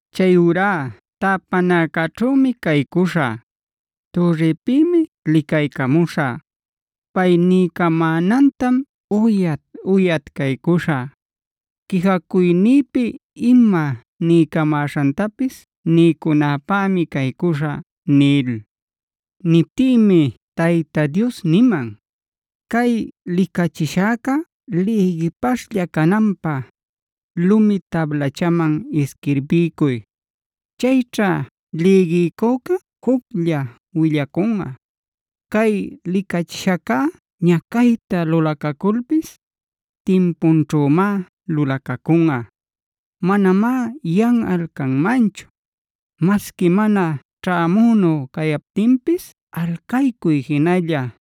“Chayurá täpanäcäćhümi caycuśhä; türripïmi licaycamuśhä. Pay niycamänantam uyat-uyat caycuśhä; quijacuynïpi ima niycamäśhantapis niycunäpämi caycuśhä” nil. Niptïmi Tayta Dios niman: “Cay licachishäca lïgipaśhlla cananpä, lumi tablachaman isquirbiycuy. Chayćha lïgiycüca juclla willacunꞌa. Cay licachishacꞌa ñacayta lulacaculpis, timpunćhümá lulacacunꞌa. Manamá yanꞌal canmanchu. Masqui mana ćhämünu cayaptinpis alcaycuy jinalla;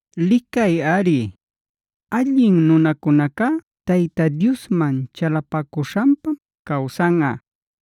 Licayꞌari, allin nunacunacá Tayta Diosman chalapacuśhanpam cawsanꞌa.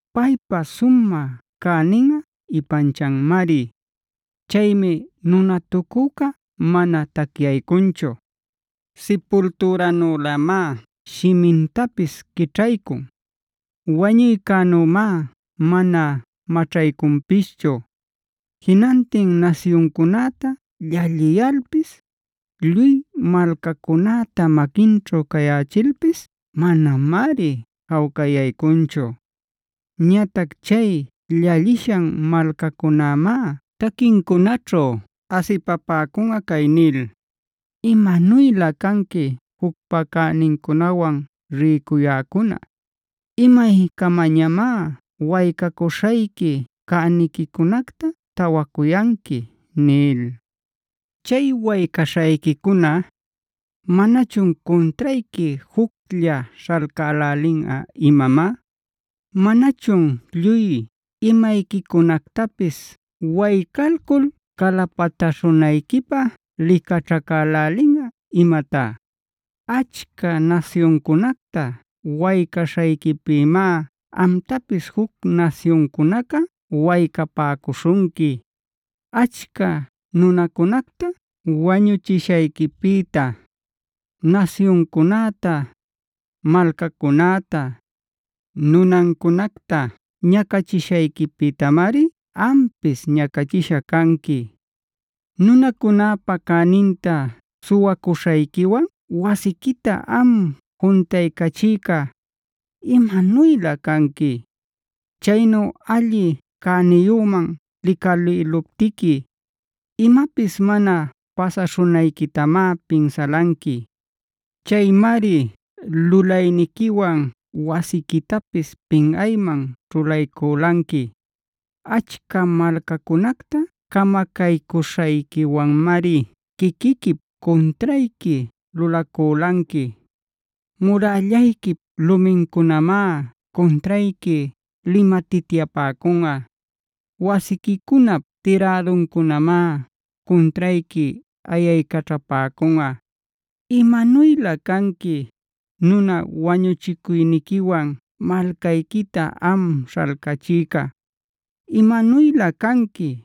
“Paypa sumä cäninꞌa ipanchanmari. Chaymi nunatucüca mana tacyaycunchu. Sipultüranülämá shimintapis quićhaycun; wañuycänümá mana maćhaycunpischu. Jinantin nasyuncunäta llalliyalpis, lluy malcacunäta maquinćhu cayächilpis manamari jawcayaycunchu. “Ñatac chay llallishan malcacunämá taquincunaćhu asipapäcunꞌa cay nil: ‘¡Imanuylä canqui jucpa cänincunawan rïcuyäcuna! ¿Imaycamañamá waycacuśhayqui cäniquicunacta tawacuyanqui?’ nil. “Chay waycaśhayquicuna, ¿manachun cuntrayqui juclla śhalcälälinꞌa imamá? ¿Manachun lluy imayquicunactapis waycalcul calapatäśhunayquipä licaćhacälälinꞌa imatá? Achca nasyuncunacta waycaśhayquipïmá amtapis juc nasyuncunaca waycapäcuśhunqui. Achca nunacunacta wañuchishayquipïta, nasyuncunäta, malcacunäta, nunancunacta ñacachishayquipïtamari ampis ñacachisha canqui. “Nunacunäpa cäninta suwacuśhayquiwan wasiquita am juntaycachïca, ¡imanuylä canqui! Chaynu alli cäniyüman licalïluptiqui, imapis mana pasaśhunayquitamá pinsalanqui. Chaymari lulayniquiwan wasiquitapis pinꞌayman ćhulayculanqui. Achca malcacunacta camacaycuśhayquiwanmari quiquiquip cuntrayqui lulaculanqui. Murällayquip lumincunamá cuntrayqui limatityapäcunꞌa. Wasiquicunap tiräduncunamá cuntrayqui ayaycaćhapäcunꞌa. “¡Imanuylä canqui, nuna wañuchicuyniquiwan malcayquita am śhalcachïca! ¡Imanuylä canqui,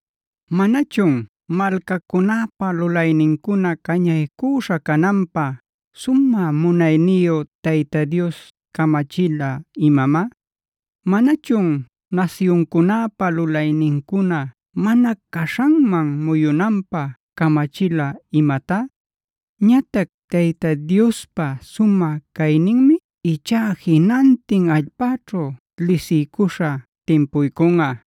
¿Manachun malcacunäpa lulaynincuna cañaycüśha cananpä sumä munayniyu Tayta Dios camachila imamá? ¿Manachun nasyuncunäpa lulaynincuna mana caśhanman muyunanpä camachila imatá? Ñatac Tayta Diospa sumä cayninmi ichá jinantin allpäćhu lisiycuśha timpuycunꞌa,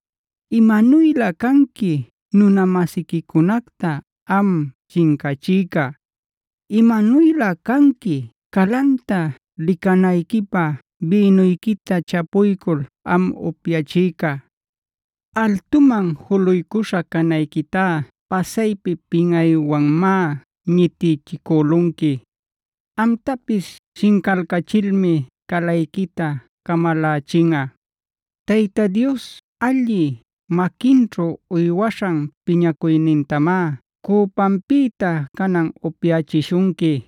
“¡Imanuylä canqui nuna-masiquicunacta am shincachïca! ¡Imanuylä canqui calanta licanayquipä bïnuyquita chapuycul am upyachïca! Altuman juluycuśha canayquitá pasaypi pinꞌaywanmá ñitichicülunqui. Amtapis shincalcachilmi calayquita camalachinꞌa. Tayta Dios allï maquinćhu uywaśhan piñacuynintamá cüpanpïta canan upyachishunqui.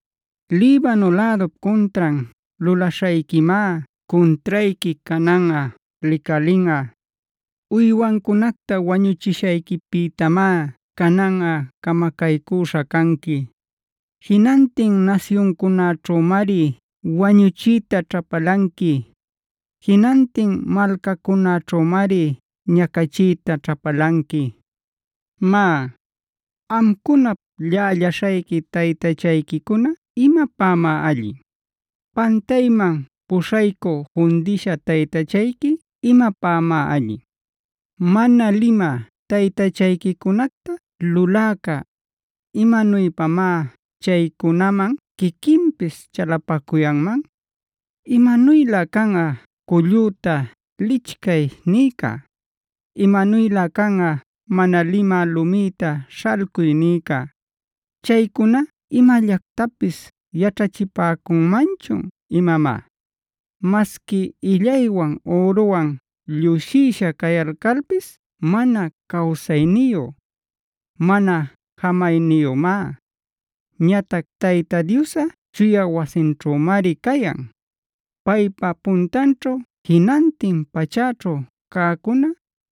Libano lädup cuntran lulaśhayquimá cuntrayqui cananꞌa licalinꞌa. Uywancunacta wañuchishayquipïtamá cananꞌa camacaycüśha canqui. Jinantin nasyuncunäćhümari wañuchiyta ćhapalanqui. Jinantin malcacunäćhümari ñacachiyta ćhapalanqui. “Má, ¿amcunap llällaśhayqui taytachayquicuna imapämá allin? ¿Pantayman puśhaycü fundïsha taytachayqui imapämá allin? ¿Mana limä taytachayquicunacta luläca, imanuypamá chaycunaman quiquinpis chalapacuyanman? “¡Imanuylä canꞌa cullüta ‘lichcay’ niyca! ¡Imanuylä canꞌa mana limä lumïta ‘śhalcuy’ niyca! ¿Chaycuna imallactapis yaćhachïpäcunmanchun imamá? Masqui illaywan üruwan llusïsha cayalcalpis mana cawsayniyu, mana jämayniyümá. Ñatac Tayta Diosꞌa chuya wasinćhümari cayan. Paypa puntanćhu jinantin pachäćhu cäcuna,